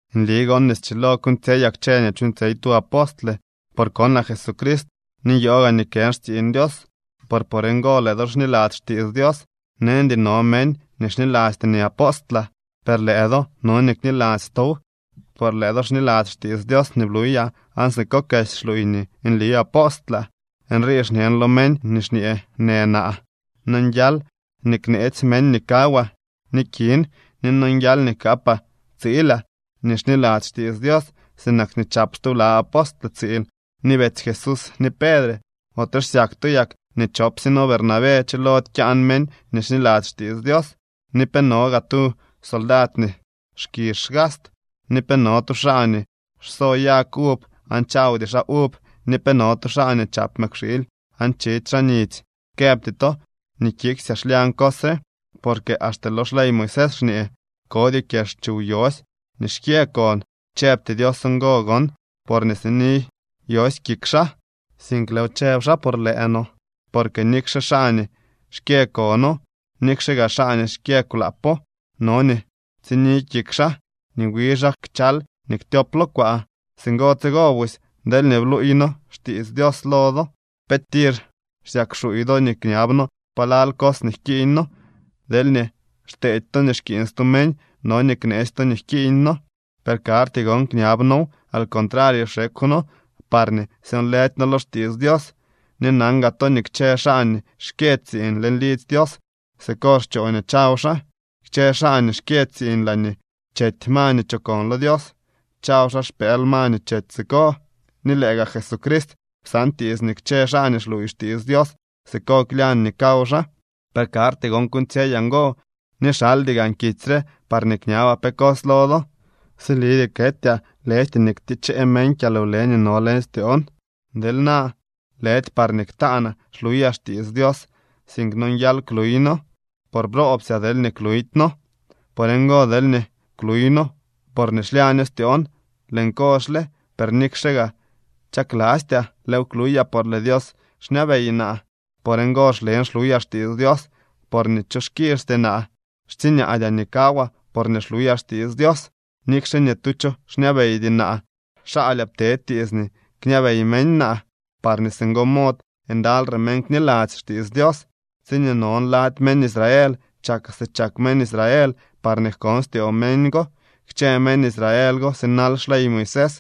Nli gon nii schilo kuuñtsyeyaa kchë nii chuuñtsyey tu apostle, por konaa Jesucrist ni nyoo gaa nii kën xtsiiñ Dios por por ngo lëë do xniladzy xtiits Dios. Neñdy no meñ nii xnilasty nii apostlaa, per lëë do no nii kniladzy tow, por lëë do xniladzy xtiits Dios nii bluyaa aan siko kesy xluuy nii nli apostlaa. Nrii xñen lo meñ nii xñee në naa: Nonguial nii kneetsy meñ nii kawaa ni kin, ni nonguial nii kaapaa tsiilaa nii xniladzy xtiits Dios, sinak nii chap stubla apostle tsiil, ni betsy Jesús, ni Pedre. ¿Ote xsyak to yak nii chopsye noo Bernabé chilody kyaan meñ nii xniladzy xtiits Dios? ¿Ni pe no gaa tu soldad nii xkizh xgast, ni pe no tu xaa nii xso yag uv aan chawdy xaa uv ni pe no tu xaa nii chap mëkwxiily aan chidy xaa nidzy? Këbty to nii kiksyaa xlyañ cos re, porque axte lo xley Moisés xñee: “Kodyoo kyex chuw yosy nii xkyë kon.” Chëbty Dios ngo gon porñee sini yosy kik xaa, sink lëëw chëb xaa por lëë no. Porque nikxe xaa nii xkyë kono, nikxe gaa xaa nii xkyë kwlaapo, no nii tsini kik xaa, nii wi xaa kchal nii ktyop lo kwaa. Singo tsigo busy deelñee bluuy noo xtiits Dios lo do, ¿pe tir xsyak xuuy do nii kñab noo palal cos nii jkiiñ noo? Deelñee xteedy to nii xkiiñ stu meñ, no nii kneetsy to nii jkiiñ noo. Per karty gon kñab noow. Al contrario, xekw noo parñee syonlëdy noo lo xtiits Dios. Ni nan gaa to nii kchë xaa nii xkyë tsiiñ leñ lidzy Dios siko xchoo nii chaw xaa. Kchë xaa nii xkyë tsiiñ laañee chety ma nii chokon lo Dios, chaw xaa xpëël ma nii chety siko. Ni lëë gaa Jesucrist psaan tiits nii kchë xaa nii xluuy xtiits Dios siko klyañ nii kaw xaa. Per karty gon kuuñtsyeyaa ngo, ni xaldy gaan kitsy re parñee kñabaa pe cos lo do. ¡Silidyee ketyaa, lëjty nii ktichee meñ kyalwle nii no leñ styoon! Deel naa, lëdy parñee ktaanaa xluyaa xtiits Dios, sink nonguial kluyno. Por ¡broobsyaa deelñee kluydyno! Por ngo, deelñee kluyno porñee xlyaño styoon, lëën kozhle. Per nikxe gaa chaklastyaa, lëëw kluyaa por lëë Dios xñabey naa. Por ngo xlen xluyaa xtiits Dios porñee cho xkizhty naa. Xtsiñaadyaa nii kawaa porñee xluyaa xtiits Dios. Nikxe ni tu cho xñabeydy naa, xaalyaa ptee tiits nii kñabey meñ naa, parñee singo mod ndaly re meñ kniladzy xtiits Dios. Tsiñee non lady meñ Israel chakaa si chak meñ Israel parñee jkon styoo meñ go. Kchë meñ Israel go sinal xley Moisés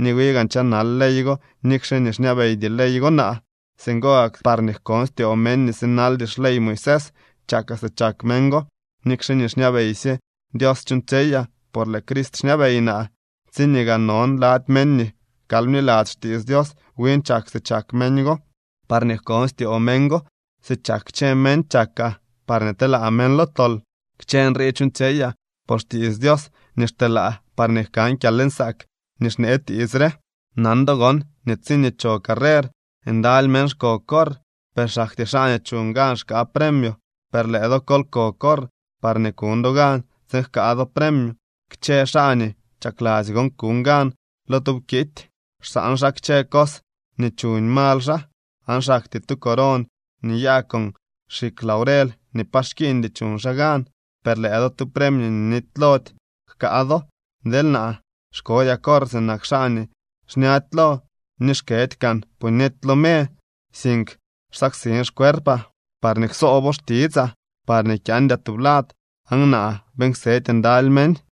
ni wi gaan chanal ley go nikxe nii xñabeydy ley go naa. Singo gak parñee jkon styoo meñ nii sinaldy xley Moisés chakaa si chak meñ go, nikxe nii xñabeysye Dios chuuñtsyeyaa, por lëë Crist xñabey naa. Tsiñee gaa non lady meñ nii kal bniladzy xtiits Dios win chak si chak meñ go parñee jkon styoo meñ go. Si chak kchë meñ chakaa, parñee telaa meñ lo tol. Kchë nrii chuuñtsyeyaa por xtiits Dios nii xteelaa, parñee jkan kyalnsaak nii xnee tiits re. Nan do gon nii tsiñee cho carrer ndaly meñ xko corr, per xaktyee xaa nii chuñ gan xkaa premio. Per lëë do kol ko corr parñee kuñ do gan tsiin jkaa do premio. Kchë xaa nii chakladzy gon kuñ gan lo tu wkity, xsaan xaa kchë cos nii chuñ mal xaa. Aan xaktyee tu coron nii nyaa con xikw laurel nii pa xkiiñdy chuñ xaa gan. Per lëë do tu premio nii nitylody jkaa do. Deel naa, xkodyaa corr sinak xaa nii xñady lo, ni xkëdy kaan puñety lo me, sink xsaksin xcuerpaa parñee ksoobo xtitsaa, parñee kyaandyaa tublad aan naa beeñ ksedy ndaly meñ.